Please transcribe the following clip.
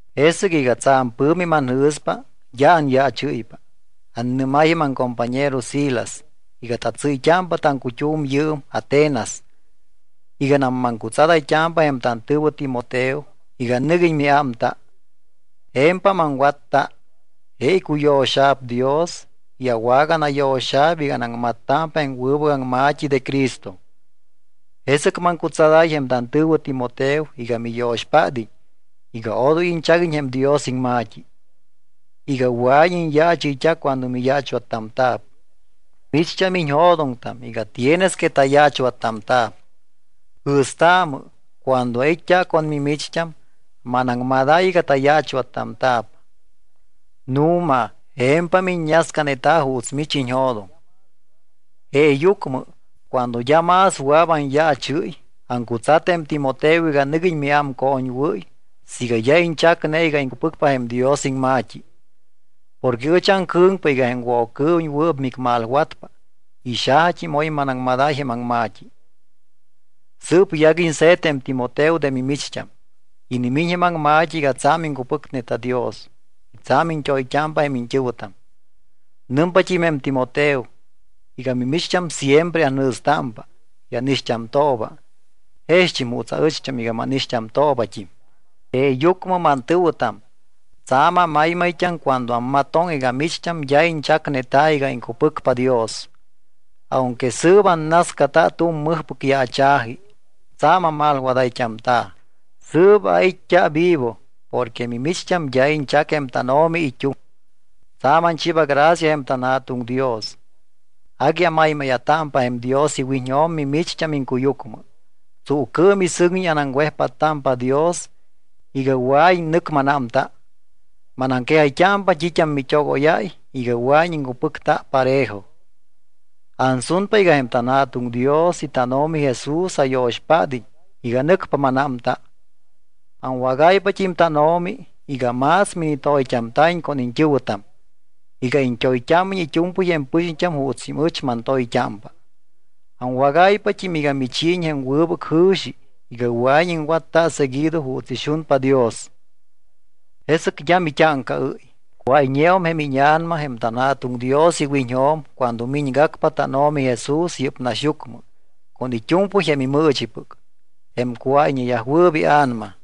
Jesɨc iga tsa̱m pɨ̱mi manjɨ̱spa, d́a anyaachɨ́ypa. Annɨ́máy jém aŋcompañero Silas iga tatsɨ́yt́ámpa taŋcut́um yɨɨm Atenas iganam maŋcutsadayt́ámpa jém tantɨ̱wɨ Timoteo iga nɨguiñ miámta. Je̱mpam aŋwatta. Je icuyo̱xa̱p Dios y awaganayo̱xa̱p iga anaŋmattámpa jém wɨbɨc aŋma̱t́i de Cristo. Jesɨc maŋcutsadáy jém tantɨ̱wɨ Timoteo iga miyo̱xpád́iñ iga odoy iñchaguiñ jém Dios iŋma̱t́i, iga wɨa̱iñ iñyaachɨyt́a cuando miyaachwattamta̱p. Micht́am iñjo̱doŋtam iga tienes que tayaachwattamta̱p. Jɨ̱staamɨ, cuando ait́t́a con mimicht́am, manaŋmadáy iga tayaachwattamta̱p. Nu̱ma je̱mpam iññascaneta juuts mich iñjo̱doŋ. Jeeyucmɨ, cuando d́a más wɨa̱p anyaachɨ́y, aŋcutsat jém Timoteo iga nɨguiñ miámcoñwɨ́y siiga d́a iñchacne iga iŋcupɨcpa jém Dios iŋma̱t́i. Porque ɨch aŋcɨ̱ŋpa iga jém Woccɨɨwiñ wɨɨp micmalwatpa y xajat́im oy manaŋmadáy jém aŋma̱t́i. Sɨɨp yaguiñ se̱t jém Timoteo de mimicht́am. Inimiñ jém aŋma̱t́i iga tsa̱m iŋcupɨcneta Dios y tsa̱m iñt́oyt́ámpa jém iñt́ɨ̱wɨtam. Nɨmpat́im jém Timoteo iga mimicht́am siempre anjɨ̱stámpa y ánixt́amtooba jext́im juuts aɨcht́am iga mánixt́amtoobat́im. Jeeyucmɨ mantɨ̱wɨtam, tsa̱m amaymayt́am cuando ammatoŋ iga micht́am d́a iñchacneta iga iŋcupɨcpa Dios, aunque yɨɨm annascata tu̱m mɨjpɨc yaacha̱ji, tsa̱m amalwadayt́amta̱. Sɨɨp ait́t́a vivo porque mimicht́am d́a iñchac jém tánO̱mi it́uŋ. Tsa̱m anchiiba gracia jém tanJa̱tuŋ Dios, agui amaymáya̱támpa jém Dios iwiñjo̱m mimicht́am iŋcuyucmɨ. Tsuucɨɨm y sɨŋñi anaŋwejpáttámpa Dios iga wɨa̱iñ nɨc mánámta. Manaŋquejayt́ámpa t́it́am mit́ogóyáy iga wɨa̱iñ iŋcupɨcta parejo. Ansunpa iga jém tanJa̱tuŋ Dios y tánO̱mi Jesús ayo̱xpád́iñ iga nɨcpa mánámta. Aŋwágayt́ámpat́im tánO̱mi iga más minitoyt́amta̱iñ con iñt́ɨ̱wɨtam, iga iñt́oyt́ámiñ it́u̱mpɨy jém pɨxiñt́am juutst́im ɨch mantoyt́ámpa. Aŋwagáypat́im iga michiiñ jém wɨbɨc jɨ̱xi iga wɨa̱iñ iŋwatta seguido juuts ixunpa Dios, jesɨc d́a mit́áŋcaɨ́y, cuáyñeum jém íña̱nama jém tanJa̱tuŋ Dios iwiñjo̱m cuando miñgacpa tánO̱mi Jesús yɨ́p naxyucmɨ con it́u̱mpɨy jém imɨɨchipɨc, jém cuáyñeyajwɨɨp ia̱nama.